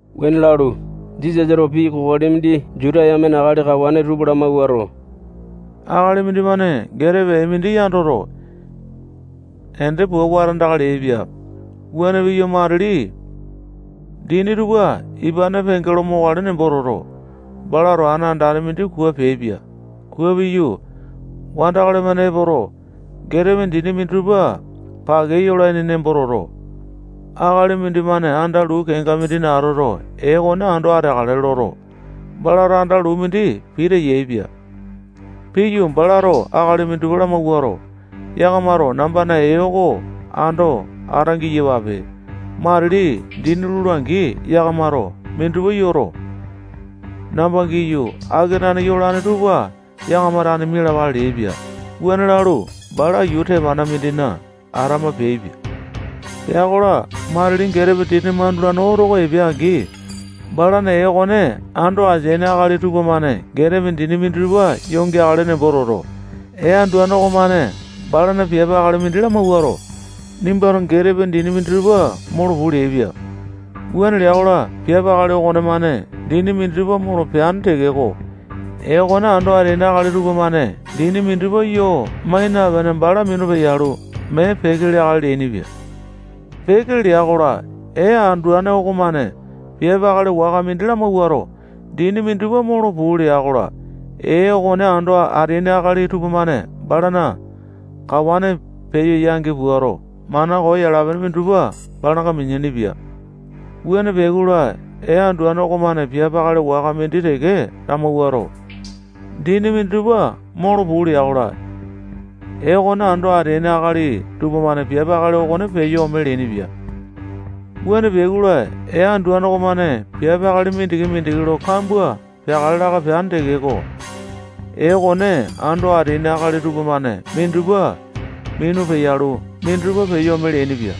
Wuane lalu, Jisasato pii kokoli mindi Juta yamena akali kawane tupa lamawuato, akali mindimane getepe ee mindi yandoto, ende pua wata aindaka leaipia. Wuane piyu, matili dini tupana ipane penge lo mokale nembo toto, balato ana andane mindi kua peaipia. Kua piyu, wandakali-mane epoto, getepe dini minditupa pake yolaini nembo toto, akali mindimane anda luu kenga mindina atoto, ee okone ando ateakale loto, balato anda luu mindi pita yaepia. Piyu, balato akali minditupa lamawuato, yakamato nambana ee oko ando ata-giyapape. Matili dini lula-angi, yakamato minditupa yoto, namba giyu, akenane yolane tupa yakama tane mialapale leaipia. Wuane lalu, bala yuu tepanda mindina atama peaipia. Pea-kola, matili getepe dini mandulane oto oko epea-angi, balana ee okone ando ateaini akali tupamane getepe dini minditupa yoo geakale nembo toto, ee anduane okomane balana piape akali mindi lamawuato, nimbato getepe dini minditupa molo puu leaipia. Wuane lea-kola, piape akali okonemane dini minditupa molo peane tekeko, ee okone ando ateaini akali tupamane dini minditupa yoo mai napene, bala minu peyalu, mee peke leakale leainipia. Peke lea-kola, ee anduane okomane piape akali waka mindi lamawuato, dini minditupa molo puu lea-kola, ee okone ando ateaini akali tupamane balana kawane peyo yangi puato, mana koo yala-pene minditupa balanga mineaini-pia. Wuane peai-kola, ee anduane okomane piape akali waka mindi teke lamawuato, dini minditupa molo puu lea-kola, ee okone ando ateaini akali tupamane piape akali okone peyo ome leainipia. Wuane peai-kola, ee anduane okomane piape akali mindiki-mindiki lo kambua peakale laka peane tekeko, ee okone ando ateaini akali tupamane minditupa minu peyalu, minditupa peyo ome leainipia.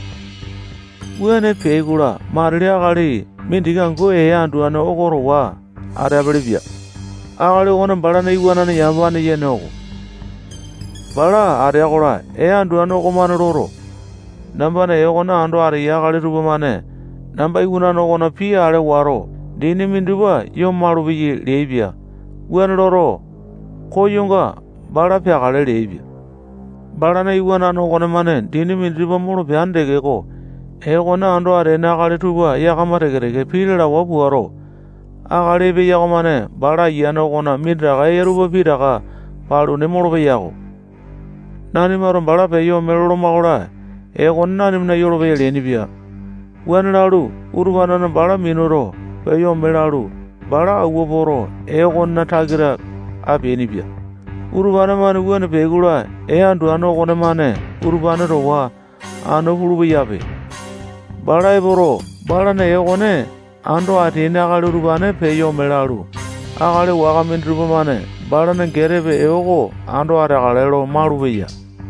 Wuane peai-kola, matili akali mindiki angu ee anduane oko towa ateapele-pia. Akali okone balana iwanane yamapane yene oko. Bala atea-kola, ee anduane okomane loto, nambana ee okone ando ateyai akali tupamane namba iwanane okona pii ale wato, dini minditupa yoo malupeyai leaipia. Wuane loto, koyonga bala peakale leaipia. Balana iwanane okonemane dini minditupa molo peane tekeko, ee okone ando ateaini akali tupa yakama teke-teke pii lalawa puato, akali epeya okomane bala ayiane okona minditaka eya tupa pitaka paluni molopeya-ko. Nanimato bala peyo ome loloma-kola, ee oko nanimana yolopeya leainipia. Wuane lalu, utupane-mane bala minuto, peyo ome lalu, bala awua poto, ee okonena takita apeainipia. Utupane-mane wuane peai-kola, ee anduane okonemane utupane towa anu pulu-peyape. Bala epoto, balana ee okone ando ateaini akali utupane peyo ome lalu, akali waka minditupa-mane balana getepe ee oko ando ateakale lo malupeya.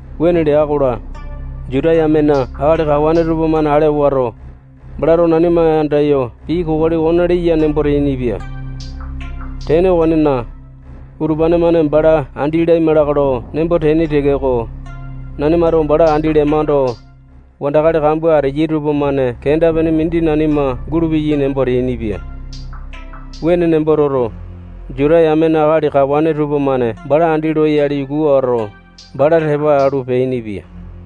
Wuane lea-kola, Juta yamena akali kawane tupamane ale wato, balato nanima andayo pii kokoli okone leya nembo teainipia. Tene okonena, utupane-mane bala andi laima lakae lo nembo teaini tekeko, nanimato bala andi lemando, wandakali kambua ateyai tupamane kenda-pene mindi nanima gulupeyai nembo teainipia. Wuane nembo toto, Juta yamena akali kawane tupamane bala andi loyale yuku wato, bala tepa alu, peainipia.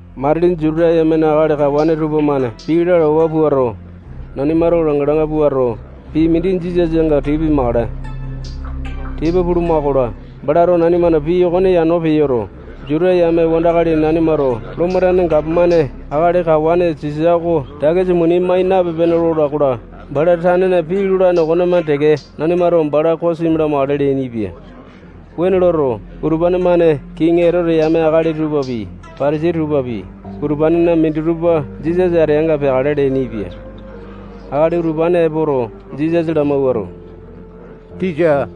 Matili Juta yamena akali kawane tupamane pii lalawa puato, nanimato langa-langa puato, pii mindi Jisasanga tipa pimakale. Tipa puluma-kola, balato nanimana pii okone yano peyoto, Juta yame wandakali nanimato Lomo tane gapomane akali kawane Sisa oko takisa muni mai napipe-pene lola-kola, bala tanena pii lolane okomane teke nanimato bala kosimi lamakale leainipia. Wuane loto, utupane-mane kiŋi Etote yame akali tupapi, Patasai tupapi, utupanena minditupa Jisasa ateanga peakale leainipia. Akali utupane epoto, Jisasa lamawuato, tisa,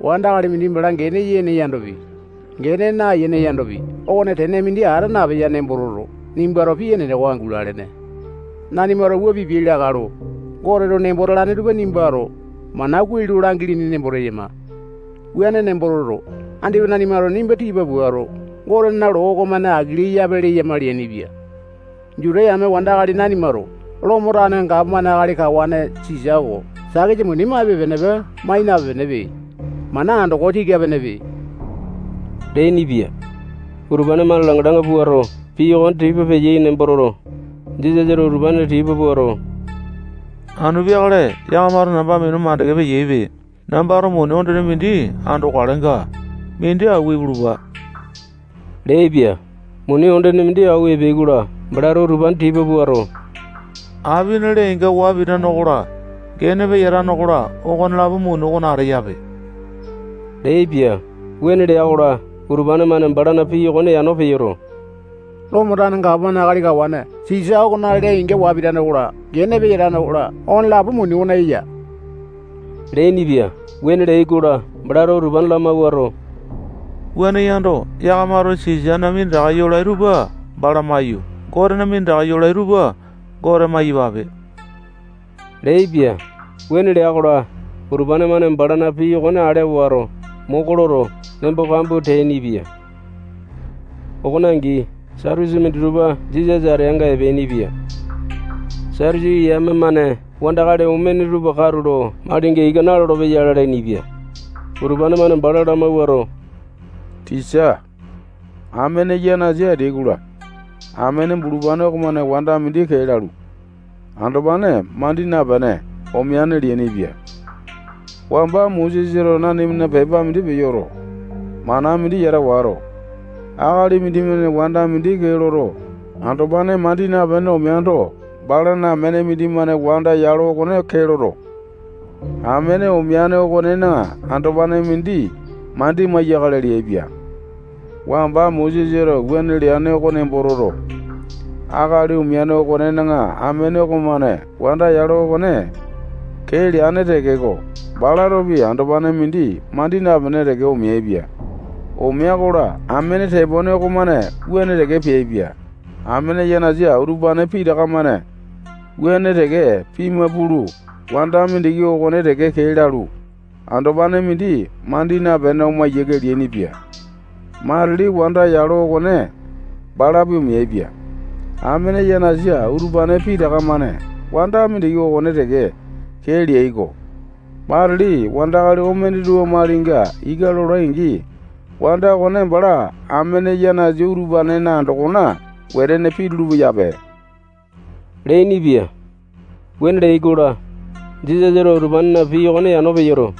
wandakali mindi bala gene yene yandopi, gene nayene yandopi, okone tene mindi ata napeya nembo toto, nimbato pii enene oko angu lalene. Nanimato wua pipiai lakae lo Goteto nembo talane tupa nimbato mana kuai lo langilini nembo teyama. Wuane nembo toto, andipa nanimato nimba tipa puato, Gotena loo okomane aki leyape leyama leainipia. Juta yame wandakali nanimato Lomo tane gapomane akali kawane Sisa oko takisa muni maipe-penepe, mai napipe-penepe. Mana andoko tika-penepe leainipia. Utupane-mane langa-langa puato, pii okone tipa peyai nembo toto, Jisasato utupane tipa puato, anu peakale yakamato namba minu mandeke peyaipe. Nambato muni ondene mindi andokalenga, mindi awua ipulupa leaipia. Muni ondene mindi awua epeai-kola, balato utupane tipa puato, apina lee-inga waa pitane okola, gene peyatane okola, okonelapo muni okona ateyape leaipia. Wuane lea-kola, utupane-mane balana pii okone yano peyoto, Lomo tane gapomane akali kawane Sisa okona lee-inga waa pitane okola, gene peyatane okola, okonelapo muni okona eya leainipia. Wuane leai-kola, balato utupane lamawuato, wuane yando, yakamato Sisana minditaka yolai tupa bala maiyu, Gotena minditaka yolai tupa Gote maiyapape leaipia. Wuane lea-kola, utupane-mane balana pii okone ale wato, moko loto, nembo kambua teainipia. Okone angi, Satusi minditupa Jisasa ateanga epeainipia. Satusi yame-mane wandakali omene tupa katulo malinga ika nalolo-peyai lalainipia. Utupane-mane bala lamawuato, tisa, amene yanasa ateai-kola, amene bulupane okomane wanda mindi kee lalu, andopane mandi napene omeane leainipia. Wamba Mosesato nanimana pepa mindi peyoto, mana mindi yata wato, akali mindimane wanda mindi kee loto, andopane mandi napene omeando, balana amene mindimane wanda yalo oko kee loto, amene omeane okonena andopane mindi mandi maiyakale leaipia. Wamba Mosesato wuane leane oko nembo toto, akali omeane okonena amene okomane wanda yalo okone kee leane tekeko, balatopi andopane mindi mandi napene teke omeaipia. Omea-kola, amene tepone okomane wuane teke peaipia. Amene yanasa utupane pitaka-mane wuane teke pima pulu, wanda mindiki okone teke kee lalu, andopane mindi mandi napene oma yiake leainipia. Matili wanda yalo okone balapi omeaipia. Amene yanasa utupane pitaka-mane wanda mindiki okone teke kee leai-ko. Matili wandakali omene tupa malinga ika lolai-angi, wanda okone bala amene yanasa utupane andokona wetene pitulu-peyape leainipia. Wuane leai-kola, Jisasato utupanena pii okone yano peyoto,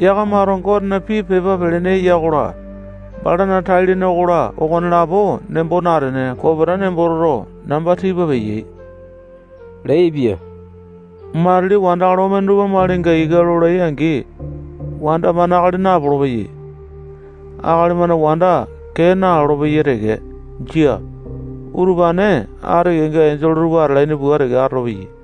yakamato Gotena pii pepa pelene eya okola, balana tai-lene okola, okonelapo nembo natene, kopeta nembo toto, namba tipa peyai leaipia. Matili wandakali omene tupa malinga ika lolai-angi, wanda-mane akali napolo-peyai. Akali-mane wanda kee nalolo-peyai teke. Jia. Utupane ati kenga enjole tupa atalaini pua teke atolopeyai.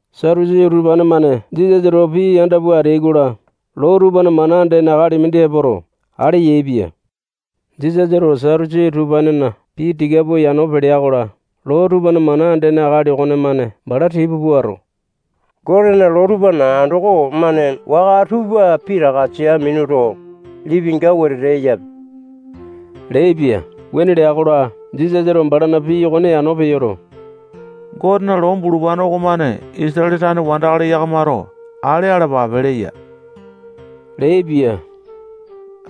Satusi utupane-mane Jisasa towa pii yanda pua ateai-kola, loo tupana mana andene akali mindi epoto, ale yaepia. Jisasato Satusi utupanena pii tika pua yano pelea-kola, loo tupana mana andene akali okonemane bala tipa puato, Gotena loo tupana andoko-mane waka tupa pitaka sia minuto, lipinga wetete eyape leaipia. Wuane lea-kola, Jisasato balana pii okone yano peyoto, Gotena loo bulupane okomane Isatale tane wandakali yakamato ale alapape leya leaipia.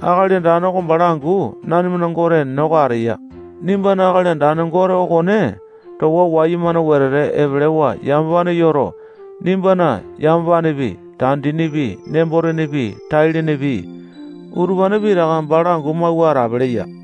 Akali Andane oko bala angu nanimana Gote enene oko ateya. Nimbana Akali Andane Gote okone towa wayumane wetete epelewa yamapane yoto, nimbana yamapanepi, tandinipi, nembo-tenepi, tai-lenepi, utupane pitaka bala angu mawua atape leya.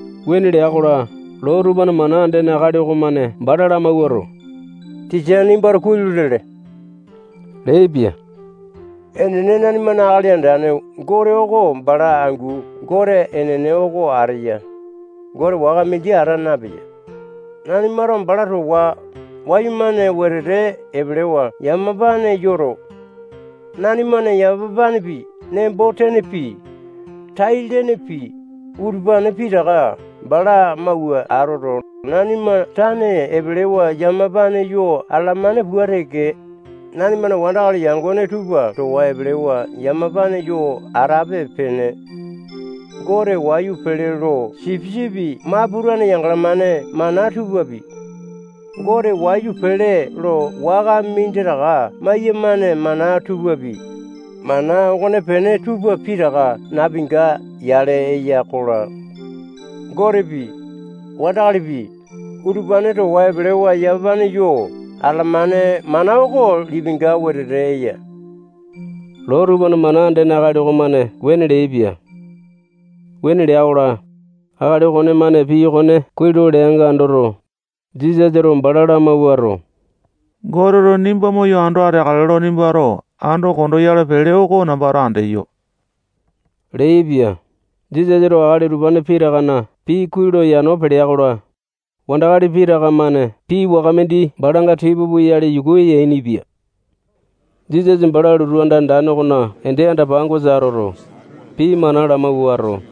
Wuane lea-kola, loo tupana mana andene akali okomane bala lamawuato, tisa, nimbato kuai lo lele leaipia. Enene, nanimana Akali Andane Gote oko bala angu Gote enene oko ateya. Gote waka mindi ata napeya. Nanimato bala towa wayumane wetete epelewa yamapane yoto, nanimana yamapanepi, nembo-tenepi, tai-lenepi, utupane pitaka bala mawua atoto, nanima tane epelewa yamapane yo atalamane pua teke, nanimana wandakali yangone tupa towa epelewa yamapane yo atape-pene. Gote wayu pele lo sipisipi maputane yangalamane mana tupapi, Gote wayu pele lo waka minditaka maiyamane mana tupapi, mana okonepene tupa pitaka napinga-yale eyai-kola, Gotepi, wandakalipi, utupane towa epelewa yamapane yo atalamane mana oko lipinga wetete eya. Loo tupana mana andene akali okomane wuane leaipia. Wuane lea-kola, akali okonemane pii okone kuai lo leanga andoto, Jisasato bala lamawuato, Goteto nimba moyo ando ateakale lo nimbato ando konda oyale pele oko nambato andeyo leaipia. Jisasato akali utupane pitakana pii kuai lo yano pelea-kola, wandakali pitaka-mane pii waka mindi balanga tipa puyale yuku yainipia. Jisasa bala lotu anda andane okona ende anda-pangosa atoto, pii mana lamawuato,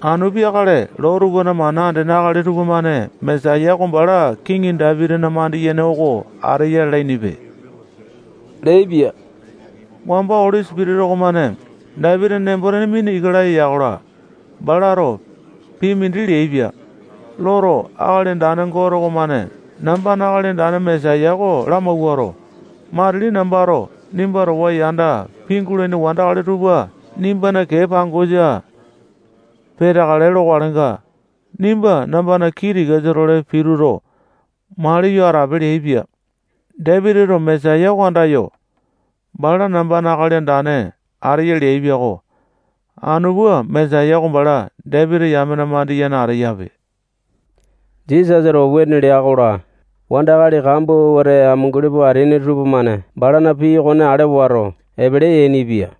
anu peakale loo tupana mana andene akali tupamane Mesaya oko bala kiŋi Dapitina mandiyene oko ateya lalainipe leaipia. Wamba Oli Sipitisa okomane Dapitina nembo-tene mina ika laya ya-kola, balato pii mindi leaipia. Loto, Akali Andane Gote okomane nambana Akali Andane Mesaya oko lamawuato, matili nambato nimba towa yanda pingulaini wandakali tupa nimbana kee pangosa peteakale lokalenga, nimba nambana kii tikasa-tole pituto, maliyo atape leaipia. Dapitito Mesaya oko andayo, bala nambana Akali Andane ateya leaipia-ko. Anu pua, Mesaya oko bala Dapiti yamena mandiyene ateyape. Jisasato wuane lea-kola, wandakali kambua wete amunguli pua ateaini tupamane balana pii okone ale wato, epele yainipia.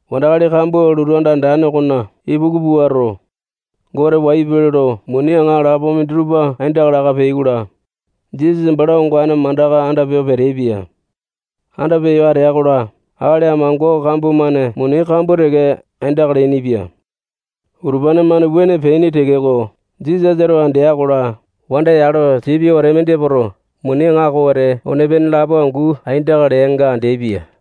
Wandakali kambua lotu anda andane okona ipuku puato, Gote wayu pele lo muni aŋalapo minditupa aindaka laka peai-kola, Jisasa bala ongane mandaka anda peyo peteaipia. Anda peyo atea-kola, akali amango kambua-mane muni kambua teke aindaka leainipia. Utupane-mane wuane peaini tekeko, Jisasato andea-kola, wanda yalo tipia wete mindi epoto, muni aŋako wete one-pene lapo angu aindaka leanga andeaipia.